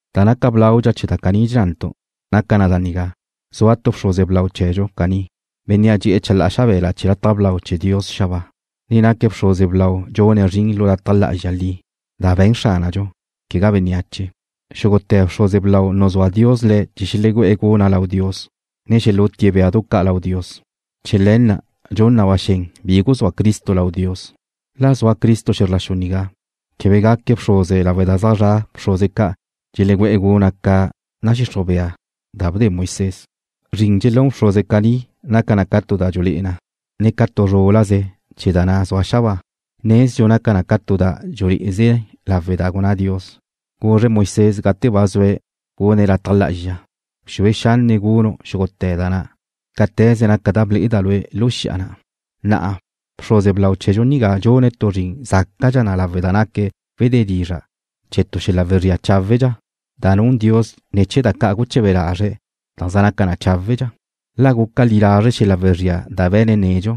Da naca blaudxa chee̱ da caní dxennantu' naca na da nigá: Zua tu bxruze blau chee̱dxu caní, Bénnea' dxe'e̱ chalá'a xabe̱la chee̱ lataj blau chee̱ Dios xabáa, ne naque̱' bxruze blau dxune̱' zrin lu lataj lá'azxa li, da be̱n Xránadxu, quegá bénneache. Xúgute̱ bxruze blau nuzúa Dios le̱' chee̱ xelegú'e̱ guna' lau Dios, ne xelútie̱' béadu ca' lau Dios. Chee̱ le̱ na' dxun na ba xen bi guzúa Cristo lau Dios. La zua Cristo xe̱zr la xu nigá, quebe gaque̱' bxruze lawe' da ne zaj zra' bxruze ca' dxelegú'e̱ guna' ca nadxixruj bea da bde Moisés. Zrin dxelún bxruze caní naca na ca tu da dxulé'eze na, ne ca tu zrúlaze chee̱ da na' zua xabáa. Nezdxu naca na tu da dxulé'eze lawe' da gunná Dios, guzre̱' Moisés gate ba zue̱' gune̱' lataj lá'azxa: “Bxue xanne' gunu' xúgute̱ na cáte̱ze naca da ble'eda' lue' lu xi'a na'.” Na'a bxruze blau chee̱dxu nigá dxune̱' tu zrin zácadxa lawe' da naque̱' wedé dizra' chee̱ tu xel-la' wezría cháwedxa, da nun Dios ne̱ chee̱ da ca' guche̱be lazre̱' da zaj naca na cháwedxa. La guca li lazre' xel-la' wezría da be̱ne̱' nedxu,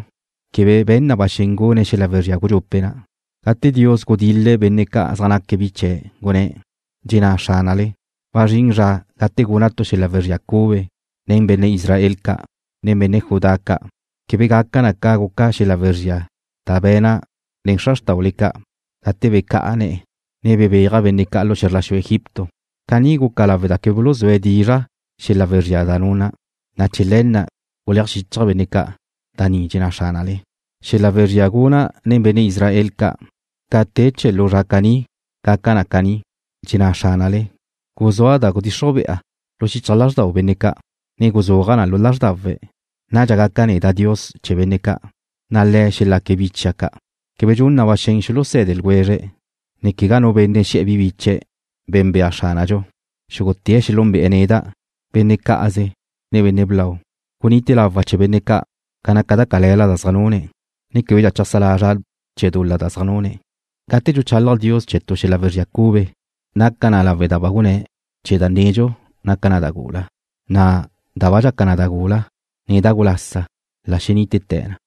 quebe be̱n na ba xen gune̱' xel-la' wezría gudxupe' na'. Gate Dios gudil-le̱' benne' ca' zaj naque̱' bi che, gunné̱': Dxenná Xránale: Wazrín zra gate guna' tu xel-la' wezría cube nen benne' Israel ca', ne benne' Judá ca'. Quebe gaca na ca guca xel-la' wezría da be̱na' nen xra xrtaule ca' gate becá'a ne̱'e̱, ne bebéaja' benne' ca' lu xe̱zr la xu Egipto. Caní guna' lawe' da quebe buluzúe̱' dizra' xel-la' wezría da nuna', na' chee̱ le̱ na' guleaj xichja' benne' ca'. Da ni dxenná Xránale. Xel-la' wezría guna' nen benne' Israel ca' ca te chee̱ lu zra caní gaca na caní, dxenná Xránale: Guzúa' da gudxixruj be'a lu xichaj lázrdau benne' ca', ne guzúaja' na lu lázrdawe̱'. Nadxa gaca' neda' Dios chee̱ benne' ca', na' le̱' xelaque̱' bi chia' ca'. Quebe gun na ba xen xuluse̱de ljwezre̱', ne quegá nu benne' xe̱'e̱ bi biche̱': Be̱nbea Xránadxu. Xúgute̱' xelúnbe'e̱ neda', benne' cá'aze, ne benne' blau. Gunite lawa' chee̱ benne' ca' ca naca da cale̱la da zaj nune̱', ne québedxa cheajsá lazra' chee̱ dul-la da zaj nune̱'. Gate dxuchalaj Dios chee̱ tu xel-la' wezría cube, naca na lawe' da ba gunné̱' chee̱ da nedxu naca na da gula, na' da ba dxaca na da gula, ne da gulasa la xenítete̱ na.